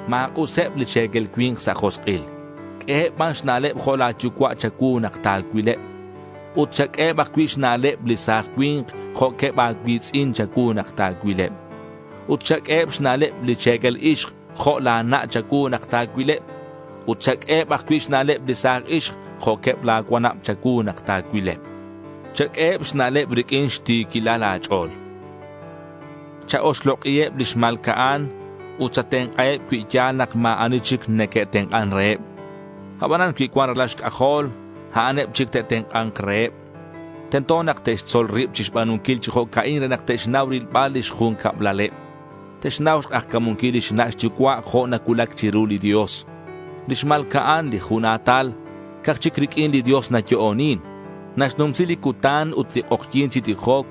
Ma̱k'useb li che̱quel cui̱nk sa' josk'il. Q'ueheb ban xna'leb jo' la̱ yucua' cha̱cuu nak ta̱cuileb. Ut chaq'ueheb ajcui' xna'leb li sa̱j cui̱nk jo'queb a̱cui̱tz'in cha̱cuu nak ta̱cuileb. Ut chaq'ueheb xna'leb li che̱quel ixk jo' la̱ na' cha̱cuu nak ta̱cuileb. Ut chaq'ueheb ajcui' xna'leb li sa̱j ixk jo'queb la̱ cuanab cha̱cuu nak ta̱cuileb. Chaq'ueheb xna'leb riq'uin xti̱quilal a̱ch'o̱l. Cha-oxlok'iheb li xma̱lca'an ut chatenk'aheb cui ya̱l nak ma̱ ani chic neque'tenk'an reheb. Abanan cui cuan ralal xc'ajol, a'an eb chic te'tenk'a̱nk reheb. Tento nak te'xtzol rib chixba̱nunquil chi jo'ca'in re nak te'xnau rilbal lix jun cablaleb. Te'xnau xk'ajca̱munquil lix na' xyucua' jo' nacuulac chiru li Dios. Li xma̱lca'an li jun a̱tal, ca'aj chic riq'uin li Dios nayo'onin. Naxnumsi li cutan ut li k'ojyi̱n chi tijoc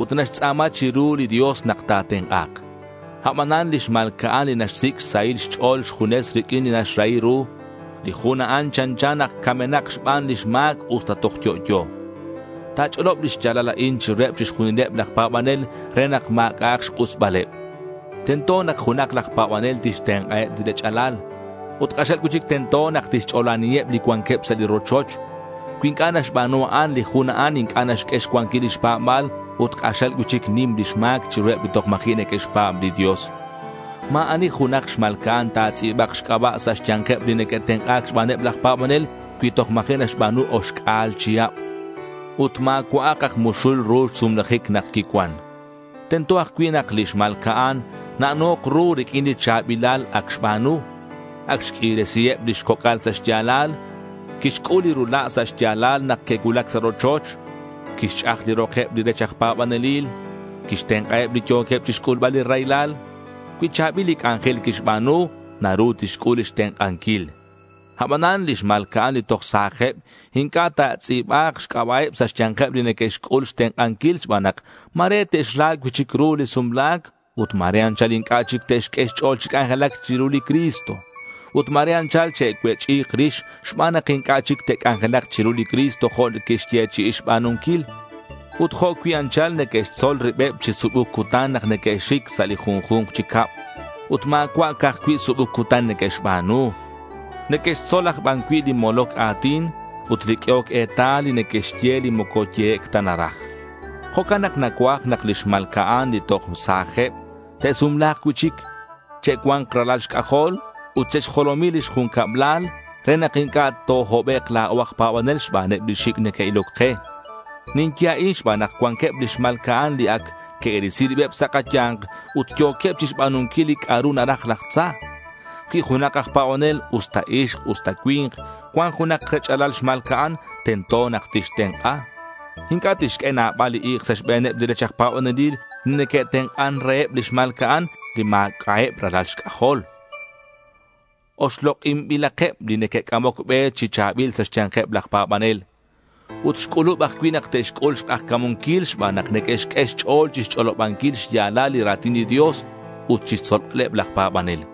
ut naxtz'a̱ma chiru li Dios nak ta̱tenk'a̱k. Abanan li xma̱lca'an li naxsic' xsahil xch'o̱l junes riq'uin li naxrahi ru, li jun a'an chanchan ac camenak xban lix ma̱c usta toj yo'yo. Ta̱ch'olob li xya̱lal a'in chiruheb chixjunileb laj pa̱banel re nak ma̱c'a'ak xk'usbaleb. Tento nak junak laj pa̱banel tixtenk'aheb li rech'alal. Ut k'axal cui'chic tento nak tixch'olaniheb li cuanqueb sa' li rochoch. Cui inc'a' naxba̱nu a'an, li jun a'an inc'a' naxq'ue xcuanquil lix pa̱ba̱l ut k'axal cui'chic nim lix ma̱c chiruheb li toj ma̱ji' neque'xpa̱b li Dios. Ma̱ ani junak xma̱lca'an ta̱tz'i̱ba̱k xc'aba' sa' xya̱nkeb li neque'tenk'a̱c xbaneb laj pa̱banel cui toj ma̱ji' naxba̱nu oxc'a̱l chihab. Ut ma̱cua'ak aj muxul ru xsumlajic nak quicuan. Tento ajcui' nak li xma̱lca'an na'no̱k ru riq'uin li cha̱bilal ac xba̱nu. Ac xq'uiresiheb lix coc'al sa' xya̱lal. Quixc'ul li rula' sa' xya̱lal nak que'cuulac sa' rochoch. Quixch'aj li rokeb li rech aj pa̱banelil. Quixtenk'aheb li yo̱queb chixc'ulbal li raylal. Cui cha̱bil li c'anjel quixba̱nu, naru tixc'ul lix tenk'anquil. Abanan, li xma̱lca'an li toj sa̱jeb inc'a' ta̱tz'i̱ba̱k xc'aba'eb sa' xya̱nkeb li neque'xc'ul xtenk'anquil xban nak ma̱re te'xra cui'chic ru li sumla̱c ut ma̱re anchal inc'a' chic te'xq'ue xch'o̱l chi c'anjelac chiru li Cristo. Ut ma̱re anchal che'cuech'i̱k rix xban nak inc'a' chic te'c'anjelak chiru li Cristo jo' que'xyechi'i xba̱nunquil. Ut jo' cui' anchal neque'xtzol ribeb chi subuc cutan nak neque'xic sa' li junju̱nk chi cab. Ut ma̱cua' ca'aj cui' subuc cutan neque'xba̱nu. Neque'xtzol aj ban cui' li moloc a̱tin ut li q'uehoc etal ut neque'xye li moco yehec' ta naraj. Jo'can nak nacuaj nak li xma̱lca'an li toj sa̱jeb te'sumla̱k cui'chic. Che'cua̱nk ralal xc'ajol ut che'xjolomi lix jun cablal re nak inc'a' tohobek' la̱o aj pa̱banel xbaneb li xic' neque'iloc ke. Ninye a'in xban nak cuanqueb li xma̱lca'an li ac que'risi ribeb sa' kaya̱nk ut yo̱queb chixba̱nunquil li c'a'ru naraj laj tza. Cui junak aj pa̱banel usta ixk usta cui̱nk, cuan junak rech'alal xma̱lca'an, tento nak tixtenk'a. Inc'a' tixq'ue nabal li i̱k sa' xbe̱neb li rech aj pa̱banelil li neque'tenk'an reheb li xma̱lca'an li ma̱c'a'eb ralal xc'ajol. Oxlok'inbilakeb li neque'c'amoc be chi cha̱bil sa' xya̱nkeb laj pa̱banel. Ut xc'ulub ajcui' nak te'xc'ul xk'ajca̱munquil xban nak neque'xq'ue xch'o̱l chixch'olobanquil xya̱lal li ra̱tin li Dios ut chixtzolbaleb laj pa̱banel.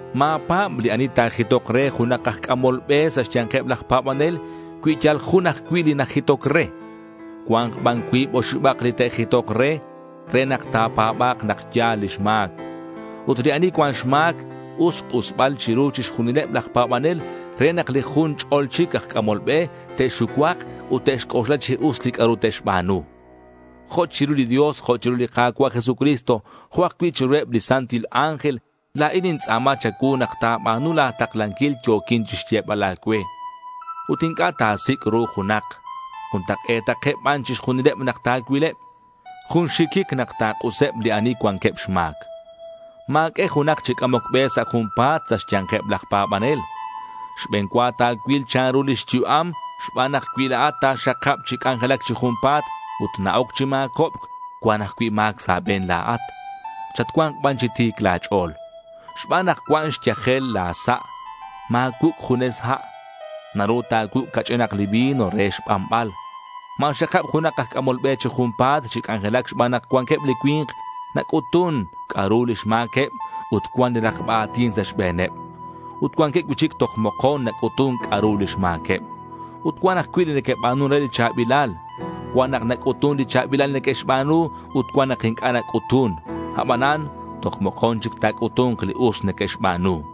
Ma̱pa̱b li ani ta̱jitok re junak aj c'amol be sa' xya̱nkeb laj pa̱banel cui yal jun ajcui' li najitoc re. Cua̱nk ban cuib oxibak li te'jitok re, re nak ta̱pa̱ba̱k nak ya̱l lix ma̱c. Ut li ani cuan xma̱c, us xk'usbal chiru chixjunileb laj pa̱banel re nak li jun ch'ol chic aj c'amol be te'xucuak ut te'xc'oxla chi us li c'a'ru te'xba̱nu. Jo' chiru li Dios, jo' chiru li Ka̱cua' Jesucristo, jo' ajcui' chiruheb li santil ángel, la̱in nintz'a̱ma cha̱cuu nak ta̱ba̱nu la̱ taklanquil yo̱quin chixyebal a̱cue. Ut inc'a' ta̱sic' ru junak. Juntak'e̱takeb ban chixjunileb nak ta̱cuileb. Jun xxiquic nak ta̱k'useb li ani cuanqueb xma̱c. Ma̱q'ue junak chi c'amoc be sa' junpa̱t sa' xya̱nkeb laj pa̱banel. Xbe̱n cua ta̱cuil chanru lix yu'am xban nak cui la̱at ta̱xakab chi c'anjelac chi junpa̱t ut na-oc chi ma̱cobc, cuan ajcui' ma̱c sa' a̱be̱n la̱at. Chatcua̱nk ban chi ti̱c la̱ ch'o̱l. Xban nak cuan xyajel la̱ sa', ma̱cuuc' junes ha'. Naru ta̱cuuc' ca'ch'inak li vino re xbanbal. Ma̱xakab junak aj c'amol be chi junpa̱t chi c'anjelac xban nak cuanqueb li cui̱nk nac'utun c'a'ru lix ma̱queb ut cuan li rakba a̱tin sa' xbe̱neb. Ut cuanqueb cui'chic toj mokon nac'utun c'a'ru lix ma̱queb. Ut cuan ajcui' li neque'ba̱nun re li cha̱bilal. Cuan nak nac'utun li cha̱bilal neque'xba̱nu ut cuan nak inc'a' nac'utun. Abanan, toj mokon chic ta̱c'utu̱nk li us neque'xba̱nu.